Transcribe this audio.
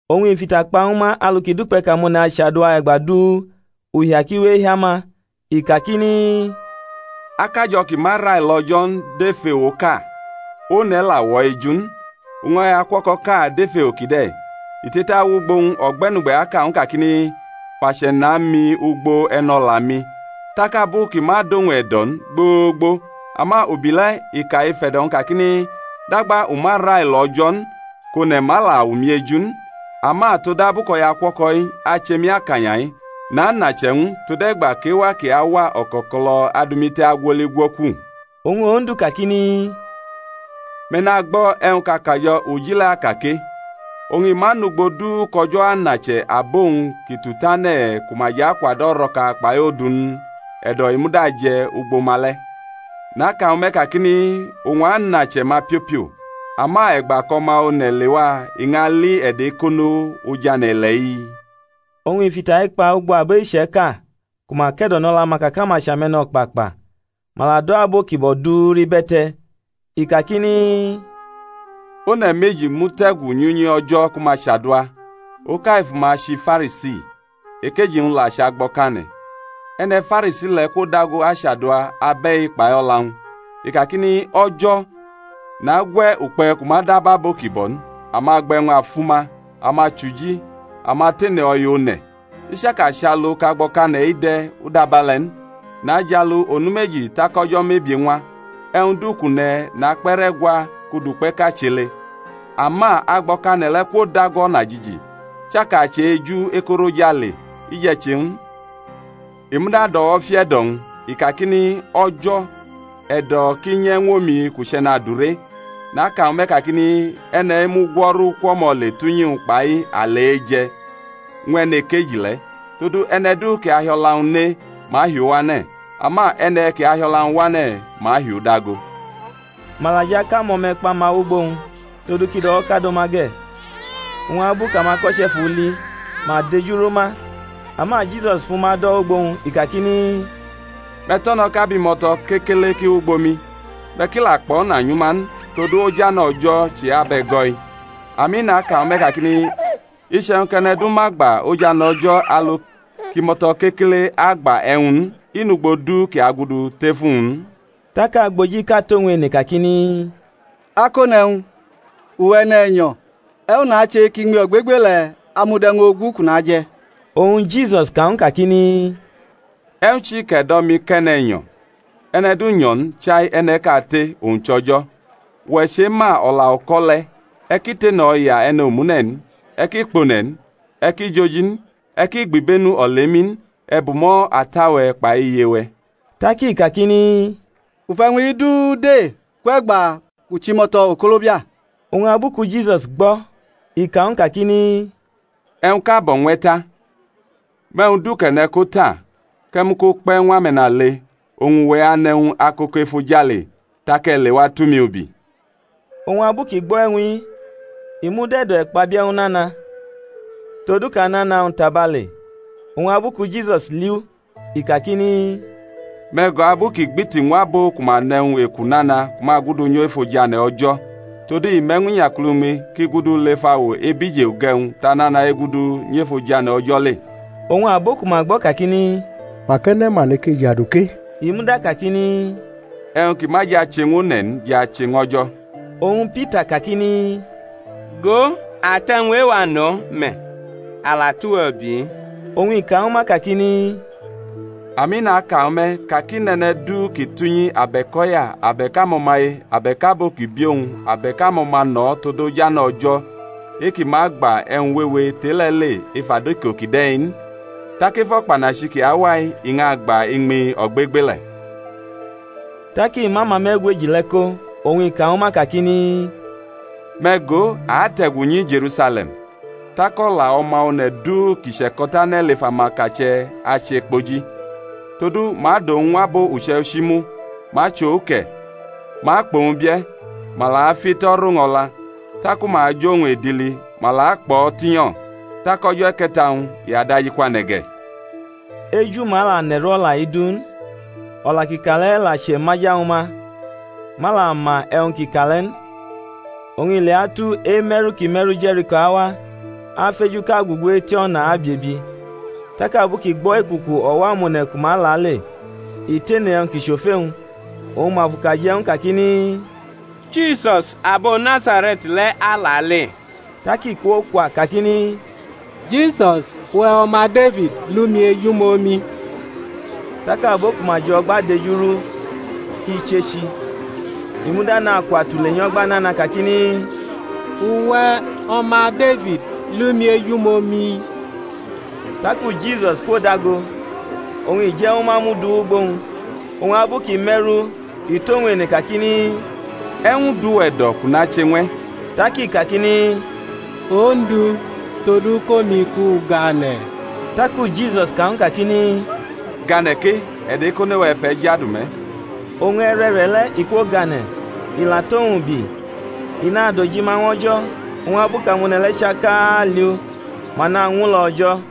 Oñ i fʼita kpa ñwu ma alu kʼi dukpe̩ kʼamone̩ achadua e̩gba du, uhia ki we ehia ma; i kakini, Akajo̩ ki ma railo O̩jo̩ n dʼef ewoʼka, one̩ la wʼo̩ eju n. Oñ o̩yaukuo̩ko̩ʼka dʼef ewo kide̩; i te̩tawʼugbo-wñ o̩gbe̩nugbe̩ aka ñw u kakini, Fʼache̩ na mi ugbo e̩no̩la-mi. Tak abu kʼi ma dʼowñ e̩do̩ n gboo̩gbo; ama ubi le̩ i ka ef e̩do̩-wñ kakini, Dagba u ma railo O̩jo̩ n, kʼone̩ ma la wʼomi eju n; ama todabu kʼo̩yaukuo̩ko̩-i ache mi akanya-i, nanʼache̩-wñ tode̩gba kʼewa kʼi awa o̩ko̩ko̩lo̩ adʼumi te̩ agwoli gwoku. Oñ Ondu kakini, Me̩ nagbo̩ e̩wñ kʼakajo̩ uji le̩ aka ke. Oñ i ma nʼugbo du kʼO̩jo̩ anʼache̩ abo-wñ kʼi tutane̩ ku ma jʼakwadʼo̩ o̩ro̩ka kpai odu n? E̩do̩ i muda aje̩ ugbo ma le̩. Naka ñwu me̩, kakini, Owñ anʼache̩ ma piopio. Ama e̩gba kʼO̩ma One̩ lewa i ñʼali e̩do̩-e̩kono̩ oj ane̩-ile̩-i? Oñ i fʼita-i kpa ugbo abo iche̩ka ku ma ke̩do̩nʼo̩la-ma ka kʼama chʼame̩no̩kpakpa, ma la do̩ abo ki bo̩ du rʼibe̩te̩. I kakini, One̩ meji mute̩gu nyʼunyi O̩jo̩ ku ma chadua; oka efu ma chʼiFarisi, ekeji-wñ la chʼagbo̩kane̩. E̩ne̩ Farisi le̩ kwodago achadua abe̩-i kpai o̩la-wñ: i kakini, O̩jo̩, nagwʼe̩ ukpe̩ kʼu ma dab abo ki bo̩ n, amagba-e̩wñ-afuma, amachuji, amatene o̩ya one̩, i chaka chʼalu kʼagbo̩kane̩-i de̩, u dabe̩le̩ n. Najalu onu meji tak o̩jo̩ mebie ñwa; e̩wñ du kʼu ne̩ nakpe̩ rʼe̩gwa kʼu dʼukpe̩ʼka chele. Ama agbo̩kane̩ le̩ kwodago o̩najiji; i chaka chʼe-eju ekorʼojale i je̩ che n; i muda dʼo̩wo̩ fiʼe̩do̩-wñ, i kakini, O̩jo̩, e̩do̩ kʼi nyʼe̩ ñw omi kʼu chʼe̩nadure. Naka ñwu me̩ kakini, e̩ne̩-i mugwo̩ru kwʼo̩mo̩ le tʼunyi-wñ kpai ale eje̩ ñw e̩nekeji le̩, todu e̩ne̩ du kʼi ahi o̩la-wñ ne ma ahi u wane̩; ama e̩ne̩ kʼi hiʼo̩la-wñ wane̩ ma ahi u dago. Ma la jʼakʼamo̩me̩kpa-ma wʼugbo owñ, todu kʼi do̩wo̩kado ma ge̩; oñ abu kʼamako̩che̩ fʼu li, ma dejuru ma. Ama Jisus fʼuma do̩ wʼugbo-wñ, i kakini, Me̩ to̩no̩ kʼabimo̩to̩ kekele ki wʼugbo mi, me̩ ki la kpo̩na nyʼuma n: todu ojane̩ O̩jo̩ chʼe-abe̩go̩-i. Ami, naka ñwu me̩ kakini, Iche̩wñ kʼe̩ne̩ du ma gba ojane̩ O̩jo̩ alu kʼimo̩to̩ kekele agba e̩wñ n, i nʼugbo du kʼi agudu tef uwñ n. Tak agbojiʼka tʼowñ ene kakini, Akone̩wñ, uwe̩ e̩ne̩nyo̩, e̩wñ nache kʼiñmi ogbegbele̩ amud e̩wñ ogu kʼu naje̩? Oñ Jisus ka ñw u kakini, E̩wñ chi kʼe̩ do̩ mi kʼe̩ne̩nyo̩? E̩ne̩ du nyo̩ n, chai e̩ne̩ kate, owñ chʼO̩jo̩. Uwe̩ chema o̩la uko̩ le̩, E̩ ki tene o̩ya e̩ne̩ omune̩ n, e̩ ki kpʼone̩ n, e̩ ki joji n, e̩ ki gbibenu olemi n, e̩ bumo̩ ata-we̩ kpai iye-we̩. Tak i kakini, U fʼe̩wñ-i du de kwʼe̩gba kʼu chʼimo̩to̩ okolobia. Oñ abu ku Jisus gbo̩, i ka ñw u kakini, E̩wñʼka bo̩ ñw e̩ ta, mʼe̩wñ du kʼe̩ ne̩ ko ta, kʼe̩ mʼu ko kpe̩ ñw ame̩nale, oñ uwe̩ anʼe̩wñ akoko efojale: tak e̩ lewa, tʼumi ubi. Oñ abu kʼi gbo̩ e̩wñ-i, i mud e̩do̩-e̩kpabie̩ ñw u nana, todu kʼanana-wñ tabale. Oñ abu ku Jisus li u i kakini, Me̩ go abu kʼi gbiti ñw abo ku ma nʼe̩wñ-eku nana ku ma gudu nyʼef ojane̩ O̩jo̩. Todu i me̩ ñw inyakulumi kʼi gudu lef awo ebije uge̩wñ tʼanana egudu nyʼef ojane̩ O̩jo̩ le. Oñ abo ku ma gbo̩ kakini, Mak e̩ne̩ ma neke ajadu ke? I muda kakini, E̩wñ ki ma je̩ ache ñw amone̩ n, je̩ ache ñw O̩jo̩. Oñ Pita kakini, Go, a tʼe̩wñ e-wa no̩ me̩, a la tʼuwe̩ ubi-i. Oñ i ka ñwu ma, kakini, Ami, naka ñwu me̩, ka kʼi nʼe̩ne̩ du kʼi tʼunyi abe̩k o̩ya abe̩k amo̩maye abe̩k abo ki bi owñ abe̩k amo̩ma no̩ tod ojane̩ O̩jo̩ e-ki ma agba e̩wñ wewe tʼe-le̩ le ef adiko kide̩ n, tak ef o̩kpanachi ki awa-i i ñʼagba iñmi ogbegbele̩. Tak i mʼamame̩gweji le̩ ko oñ i ka ñwu ma kakini, Me̩ go, a ate̩gu nyi Je̩rusale̩m, tak o̩la O̩ma One̩ du ki che̩ko̩tane̩ lef amakache̩ achekpoji. Todu ma adʼowñ ñw abo uche̩ichi mu, ma achʼo uke̩, ma akpʼowñ bie̩, ma la afiʼito̩ rʼowñ o̩la; taku ma ajʼowñ edili, ma la akpʼo̩ tinyo, tak o̩jo̩ e̩ke̩ta-wñ i udajikwane̩ ge̩. Eju-ma la ne̩m o̩la-i du n; o̩la kʼi ka le̩ la chemaja ñwu ma, ma la ma e̩wñ kʼi ka le̩ n. Oñ i leatu, eme̩ru kʼi me̩ru Je̩riko awa, afejuʼka gugu eti o̩na abiebi. Tak abu kʼi gbo̩ ekuku o̩wo̩-amone̩ ku ma lale, i tene e̩wñ ki chʼofe-wñ. Oñ ma fʼuka je̩ ñw u kakini, Jisus abo Nazare̩t le̩ alale. Tak i kwokwa kakini, Jisus, uwe̩ O̩ma Defid, lʼumi ejumomi. Tak abo ku ma jʼo̩gba dejurʼu kʼi chechi: i muda nakwa tule nyo̩gba nana kakini, Uwe̩, O̩ma Defid, lʼumi ejumomi. Taku Jisus kwodago, oñ i je̩ ñwu ma mʼu du wʼugbo owñ. Oñ abu kʼi me̩rʼu, i tʼowñ ene kakini, E̩wñ dʼuwe̩ e̩do̩ kʼu nache ñw e̩? Tak i kakini, Ondu, todu kʼomi kʼu gane̩. Taku Jisus ka ñw u kakini, Gane̩ ke; e̩do̩-ekono-we̩ fʼe̩ jadu me̩. Oñ e̩re̩re̩le̩ i kwogane̩, i la tʼowñ ubi, i nadojima ñw O̩jo̩: oñ abu kʼamone̩ le̩ chaka li u, ma nañwulo̩ O̩jo̩.